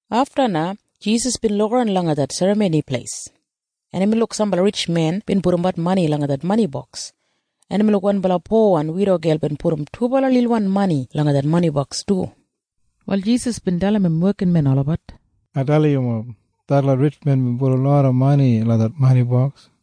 Afta na Jisas bin lukaran langa det Serramoni Pleis, en imbin luk sambala ritjmen bin pudumbat mani langa det mani boks, en imbin luk wanbala powan widogel bin pudum dubala lilwan mani langa det mani boks du. Wal Jisas bin dalim im wekinmen olabat, “Ai dalim yumob. Detlot ritjmen bin pudum loda mani langa det mani boks.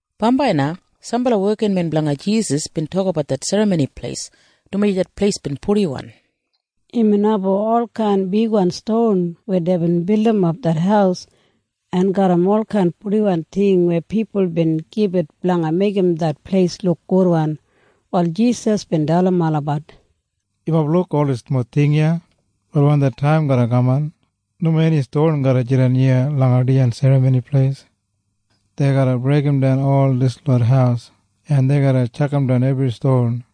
Bambai na sambala wekinmen blanga Jisas bin tokabat det Serramoni Pleis, dumaji det pleis bin purdiwan garram olkain bigwan ston weya deibin bildimap det haus en garram olkain purdiwan ting weya pipul bin gibit blanga meigim det pleis luk gudwan. Wal Jisas bin dalim olabat, “Yumob luk ol dislot ting iya? Wal wen det taim garra kaman, nomo eni ston garra jidan iya langa dijan Serramoni Pleis. Dei garra breigimdan ol dislot haus, en dei garra tjakamdan ebri ston.”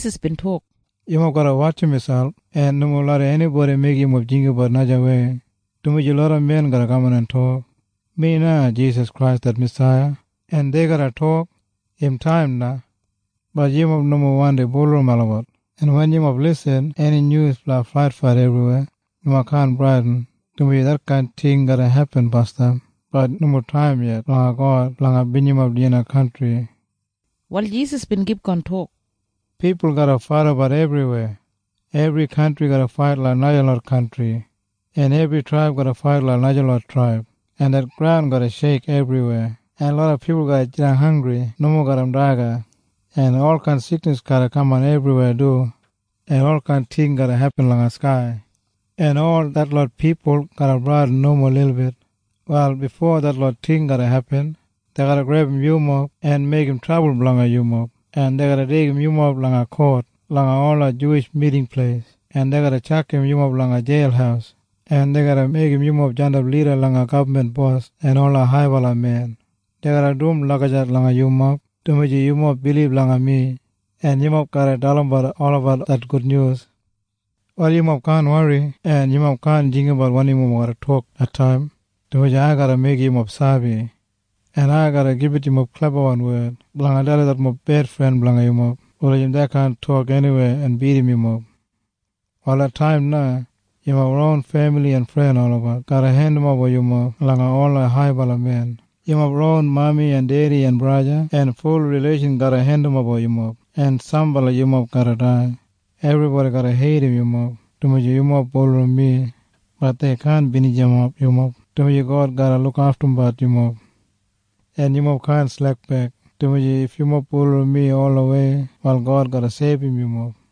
Wal Jisas bin tok, “Yumob garra wotjim miselp en nomo larram enibodi meigim yumob jinggabat najawei, dumaji loda men garra kaman en tok, ‘Mi na Jisas Krais det Masaiya.’ En dei garra tok, ‘Im taim na.’ Bat yumob nomo wandi bulurrum olabat. En wen yumob irrim eni nyus blanga faitfait ebriweya, yumob kaan bradin, dumaji detkain ting garra hepin basdam. Bat im nomo taim yet blanga God blanga binijimap dijan kantri.” Wal Jisas bin kipgon tok, “Pipul garra faidabat ebriweya. Ebri kantri garra fait langa najalot kantri, en ebri traib garra fait langa najalot traib, en det graun garra sheik ebriweya, en loda pipul garra jidan hanggri nomo garram daga, en olkain siknis garra kamat ebriweya du, en olkain ting garra hepin langa skai, en ol detlot pipul garra bradin nomo lilbit. “Wal bifo detlot ting garra hepin, dei garra grebum yumob en meigim trabul blanga yumob, en dei garra deigim yumob langa kot langa ola Juwish Miting Pleis, en dei garra tjakam yumob langa jeil, en dei garra meigim yumob jandap lida langa gabman bos en ola haibala men. Dei garra dum lagijat langa yumob dumaji yumob bilib langa mi. En yumob garra dalimbat olabat det gudnyus. “Wal yumob kaan wori, en yumob kaan jinggabat wanim yumob garra tok det taim, dumaji ai garra meigim yumob sabi, en ai garra gibit yumob klebawan wed blanga dalim detlot bedfren blanga yumob wulijim dei kaan tok eniwei en bidim yumob. “Wal det taim na yumob ron femili en fren olabat garra hendimoba yumob langa ola haibala men. Yumob ron mami en dedi en braja en ful rileishan garra hendimoba yumob en sambala yumob garra dai. Ebribodi garra heidim yumob dumaji yumob bulurrum mi. Bat dei kaan binijimap yumob, dumaji God garra lukaftumbat yumob. En yumob kaan slekbek, dumaji if yumob bulurrum mi olawei, wal God garra seibum yumob.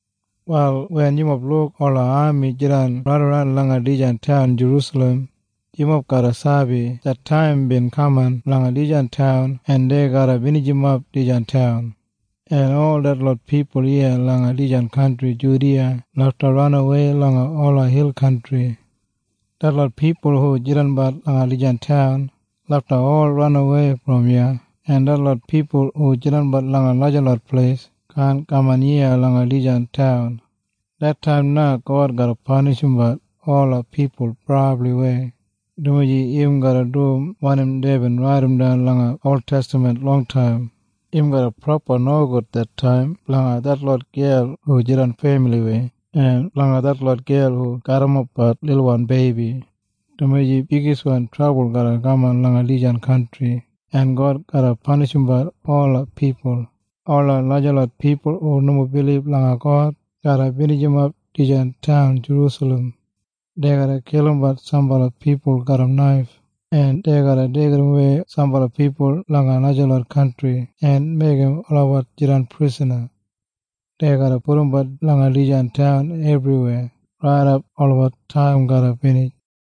“Wal wen yumob luk ola ami jidan raidaran langa dijan taun Jerusalem, yumob garra sabi det taim bin kaman blanga dijan taun en dei garra binijimap dijan taun. En ol detlot pipul iya langa dijan kantri Judiya lafta ranawei langa ola hil kantri. Detlot pipul hu jidanbat langa dijan taun lafta ol ranawei brom iya, en detlot pipul hu jidanbat langa najalot pleis kaan kaman iya langa dijan taun. “Det taim na God garra panishimbat ola pipul brabliwei, dumaji im garra dum wanim deibin raidimdan langa oltestaman longtaim. Im garra brabli nogud det taim blanga detlot gel hu jidan femiliwei en blanga detlot gel hu garrimapbat lilwan beibi, dumaji bigiswan trabul garra kaman langa dijan kantri, en God garra panishimbat ola pipul. Ola najalot pipul hu nomo bilib langa God garra binijimap dijan taun Jerusalem. Dei garra kilimbat sambala pipul garram naif, en dei garra deigidawei sambala pipul langa najalot kantri en meigim olabat jidan prisana. Dei garra pudumbut langa dijan taun ebriweya raidap olabat taim garra binij.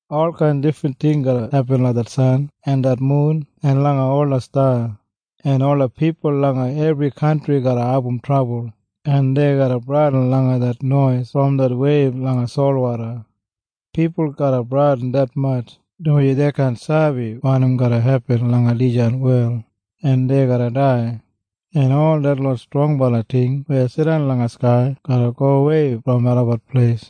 “Olkain difrin ting garra hepin langa det san en det mun en langa ola sta, en ola pipul langa ebri kantri garra abum trabul, en dei garra bradin langa det nois brom det weib langa solwoda. Pipul garra bradin detmatj, dumaji dei kaan sabi wanim garra hepin langa dijan wel. En dei garra dai. En ol detlot strongbala ting weya jidan langa skai garra gowei brom olabat pleis.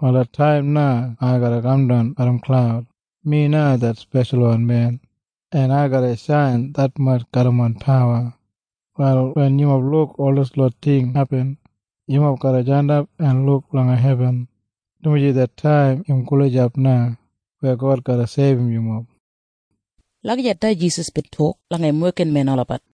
“Wal det taim na ai garra kamdan garram klaud. Mi na det Speshalwan Men, en ai garra shain detmatj garram main pawa. “Wal wen yumob luk ol dislot ting hepin, yumob garra jandap en luk langa hebin, dumaji det taim im gulijap na weya God garra seibum yumob.” Lagijat na Jisas bin tok langa im wekinmen olabat.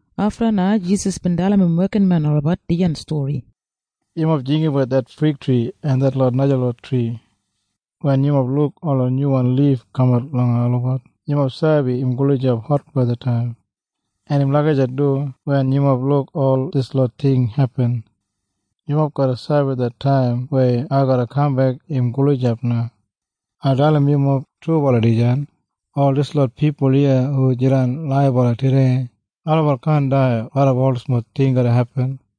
Afta na Jisas bin dalim im wekinmen olabat dijan stori, “Yumob jinggabat det figtri en detlot najalot tri. Wen yumob luk ola nyuwan lif kamat langa olabat, yumob sabi im gulijap hotwethataim. En im lagijat du wen yumob luk ol dislot ting hepin. Yumob garra sabi det taim weya ai garra kambek im gulijap na. “Ai dalim yumob trubala dijan. Ol dislot pipul iya hu jidan laibala tudei, olabat kaan dai raidap ol dislot ting garra hepin.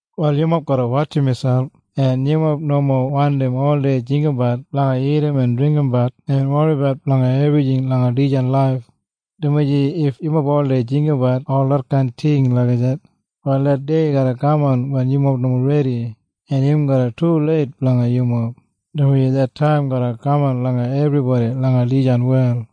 “Wal yumob garra wotjim miselp. En yumob nomo wandi oldei jinggabat blanga dagat en dringgimbat en woribat blanga ebrijing langa dijan laif, dumaji if yumob oldei jinggabat ol detkain ting lagijat, wal det dei garra kaman wen yumob nomo redi, en im garra tuleit blanga yumob, dumaji det taim garra kaman langa ebribodi langa dijan wel.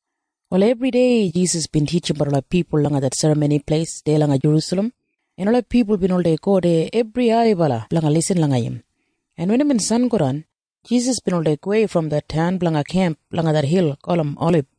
Wal ebridei Jisas bin titjimbat ola pipul langa det Serramoni Pleis deya langa Jerusalem, en ola pipul bin oldei go deya ebri ailibala blanga lisin langa im. En wen imbin sangodan, Jisas bin oldei gowei brom det taun blanga kemp langa det hil gulum Olib.